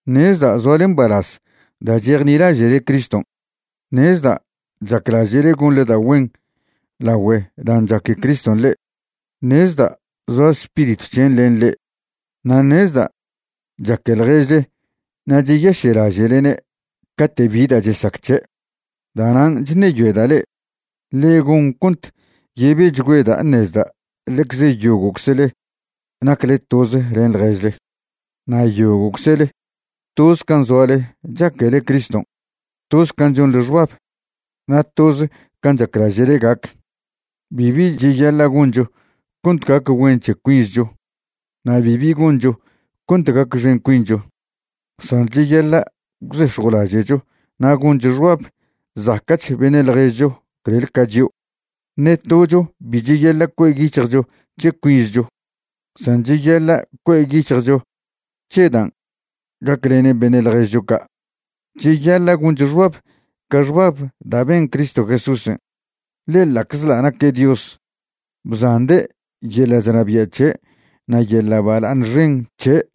Ṉezda' zoale mbalaz da' chejnilaže'le Criston', ṉezda' chaclaže'le gonḻe da' güen lagüe dan' chaque Criston' le'e, ṉezda' zoa Spiritw c̱hen' len le'e, na' ṉezda' chaque ḻježle na' cheyaše'laže'lene' cate' bi da' chesac c̱he'. Da'nan' chṉeyoeda' le'e, ḻe gon cont yebechgüeda' ṉezda' ḻecze yogo'czle nacle toz len ḻježle, na' yogo'czle toz can' zoale chaquele Criston', toz can' chonḻe xbab, na' toz can' chaclaže'le gac. Bibi cheyaḻa' goncho cont gac güen c̱he cuinzcho na' bibi goncho cont gacxen cuincho, san cheyaḻa' gwzex̱jwlaže'cho na' goncho xbab zaca'ch beṉe' ḻježcho clel ca chio'. Ṉe tocho bi cheyaḻa' cue' yic̱hjcho c̱he cuinzcho, san cheyaḻa' cue' yic̱hjcho c̱he dan' gaclenen beṉe' ḻježcho ca'. Cheyaḻa' goncho xbab ca xbab da' ben Cristo Jesúsen'. Ḻe ḻa'czḻa' naque' Dios, bzande' yeḻa' chnabia' c̱he' na' yeḻa' bala'aṉ xen c̱he'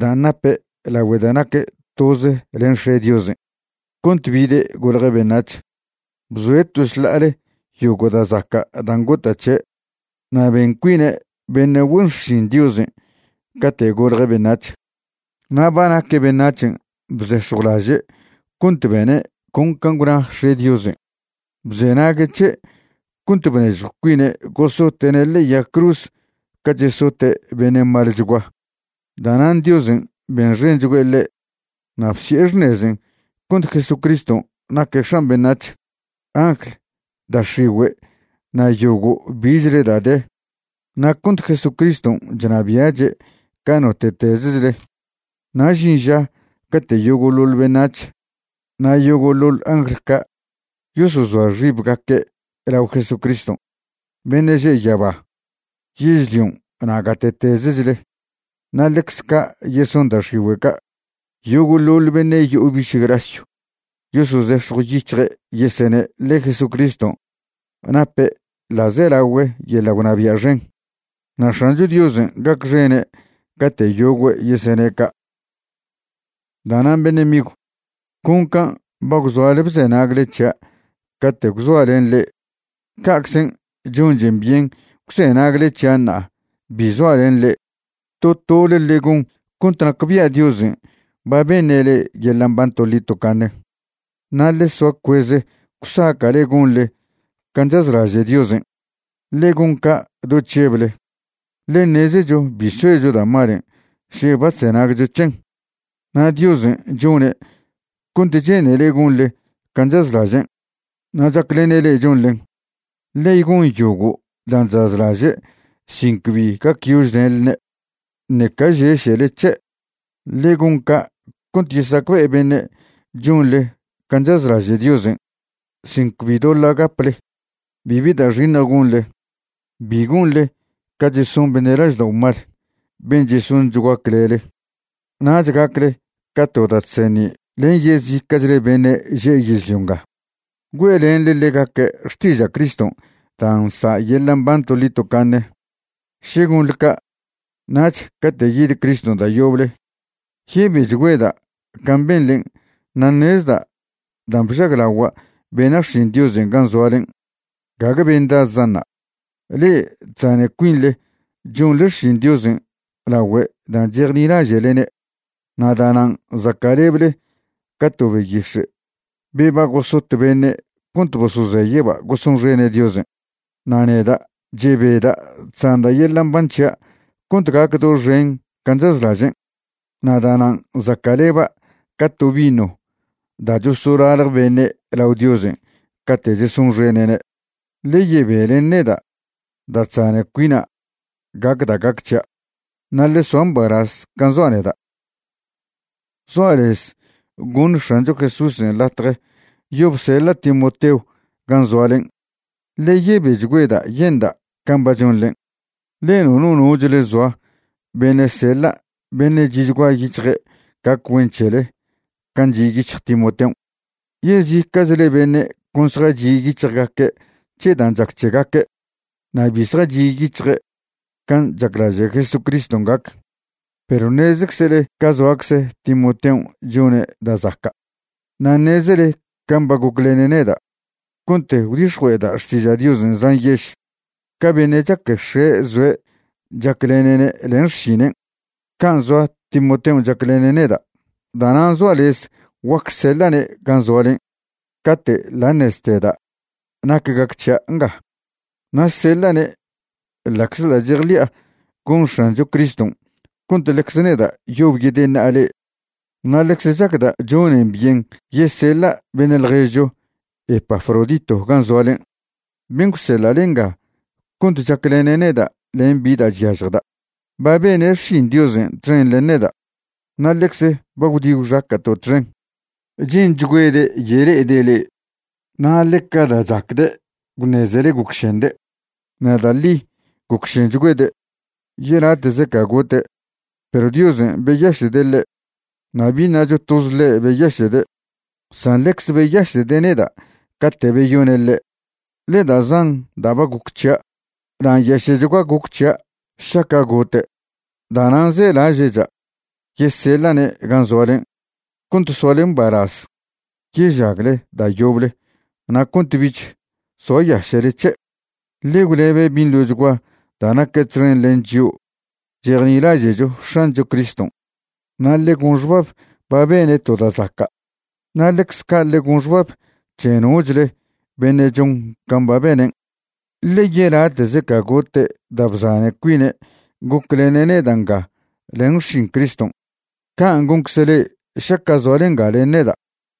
dan' nape' lagüe da' naque' toz len X̱e' Diosen' cont bide' golje' beṉac̱h. Bzoe' to šḻa'ale yogo' da' zaca' dan' gota' c̱he', na' ben cuine' beṉe' güen xšin Diosen' cate' golje' beṉac̱h. Na' ba naque' beṉac̱hen' bzex̱jwlaže' cont bene' con can' gwna X̱e' Diosen'. Bzenague' c̱he' cont bnežjw cuine' gosote'ne' ḻe'e yag cruz ca chesote' beṉe' malchgua. Da'nan' Diosen' benxenchgüe' ḻe' na' bsi'e xṉezen' cont Jesucriston' naque' X̱an beṉac̱h, angl, da' x̱igüe' na' yogo' bichle da' de, na' cont Jesucriston' chnabia'che' ca note'tezechle. Na' žin ža cate' yogo'ḻoḻ beṉac̱h na' yogo'ḻoḻ angl ca' yosozoa xibgaque' lao Jesucriston', beṉe' že' yaba, yežlion' na' gate'tezechle. Na' ḻecze ca' yeson da' x̱igüe' ca'. Yogo'ḻoḻ beṉe' yo'o biš grasyw yosozex̱jwyic̱hje' yesene' ḻe Jesucriston' nape' ḻa'zelagüe yeḻa' gwnabia' xen. Na' X̱ancho Diosen' gacxene' cate' yogüe' yesene' ca'. Da'nan' beṉe' migw, con can' ba gwzoale bzenagle c̱hia' cate' gwzoa' len le'e, ca'czen' chonchen byen gwzenagle c̱hia' ṉa'a bi zoa' len le'e. To tole ḻe gon cont nacbia' Diosen' ba beṉe' le'e yeḻa' mban toḻi tocaṉe, na' ḻe soa cueze gwsaca'le gonḻe can' chazlaže' Diosen'. Ḻe gon ca' do chžeble, ḻe ṉezecho bi soecho da' malen' še ba chzenagcho c̱hen. Na' Diosen' chone' cont che'nele gonḻe can' chazlažen', na' chaclene' le'e chonḻen. Ḻe gon yogo' dan' chazlaže' sin cbi gacyožlenḻne', ṉeca žeše'le c̱he'. Ḻe gon ca' cont yesacbe'e beṉe' chonḻe can' chazlaže' Diosen' sin cbi doḻa' gaple. Bibi da' xiṉj gonḻe. Bi gonḻe ca cheson beṉe' laždao' mal ben' chesonchgua clele. Nach gacle ca to da' chseṉi' len yezica'chle beṉe že' yežlio nga, güe'lenḻe ḻegaque' xtiža' Criston' da' nsa' yeḻa' mban toḻi tocaṉe. Še gonḻe ca', nach cate' yid Criston' da' yoble, yebechgüeda' can' benḻen' na' ṉezda' dan' bžaglagua' bena' xšin Diosen' gan' zoalen', gague bendadzan'ṉa'. Le'e chzane cuinḻe chonḻe xšin Diosen' lagüe dan' chejnilaže'lene', na' da'nan' zaca'leble ca to beyix̱e' be ba gosot beṉe' cont bosozeye'ba' gosonxene' Diosen'. Na' neda', chebeda' chzanda' yeḻa' mban c̱hia' cont gac doxen can' chazlažen', na' da'nan' zaca'leba' ca to vino da' chosolalje beṉe' lao Diosen' cate' chesonxene'ne'. Ḻe yebe len neda' da' chzane cuina' gac da' gac c̱hia', na' ḻe soa mbalaz can' zoa' neda'. Zoa' lez goṉ X̱ancho Jesúsen' latje yob seḻa' Timoteo gan' zoalen', ḻe yebechgüeda' yenda' can' ba chonḻen'. Ḻe nono nochle zoa beṉe' seḻa' beṉe' chi'chgua yic̱hje' gac güen c̱hele can' chi' yic̱hj Timoteon'. Yezica'chle beṉe' con zjachi' yic̱hjgaque' c̱he dan' chac c̱hegaque', na' bi zjachi' yic̱hje' can' chaclaže' Jesucriston' gac. Perw ṉezeczele ca zoacze Timoteon' chone' da' zaca', na' ṉezele can' ba goclene' neda' cont gwdix̱jue'eda' xtiža' Diosen' zan yež. Ca beṉe' chaque x̱e' zoe' chaclene'ne' len xšinen', can' zoa Timoteon' chaclene' neda'. Da'nan' zoa' lez guac seḻa'ne' gan' zoalen' cate' ḻa' ṉezteda' nac gac c̱hia' nga, na' seḻa'ne' ḻa'czḻa' chejḻi'a gon X̱ancho Criston' cont ḻecze neda' yob yedeṉa'a le'e. Na' ḻecze chacda' chonen byen yeseḻa' beṉe' ḻježcho Epafrodito gan' zoalen', ben' gwseḻa'le nga cont chaclene' neda' len bi da' chyažjda'. Ba bene' xšin Diosen' txen len neda', na' ḻecze ba gwdi gwxaca'to' txen. Che'nchgüede' yele'ede' le'e, na' ḻeca da' chacde' gwṉezele gocšende'. Na' da' ḻi gocšenchgüede', yelate'ze ca gote', perw Diosen' beyaše'de' ḻe', na' bi ṉacho toz ḻe' beyaše'de', san ḻecze beyaše'de' neda' cate' beyone' ḻe', ḻe da' zan da' ba goc c̱hia' na' nyaše'chgua goc c̱hia' šaca' gote'. Da'nan' zelaže'cha' yeseḻa'ne' gan' zoalen' cont soale mbalaz yežagle da' yoble na' cont bich soayaše'le c̱he'. Ḻe gwlebe' binḻochgua da' naque' txen len chio' chejnilaže'cho X̱ancho Criston', na' ḻe gon xbab ba bene' to da' zaca', na' ḻecze ca' ḻe gon xbab c̱he nochle beṉe' chon can' ba benen'. Ḻe yelate'ze ca gote' da' bzane cuine' goclene' neda' nga len xšin Criston', can' goncze le'e šaca' zoale nga len neda'.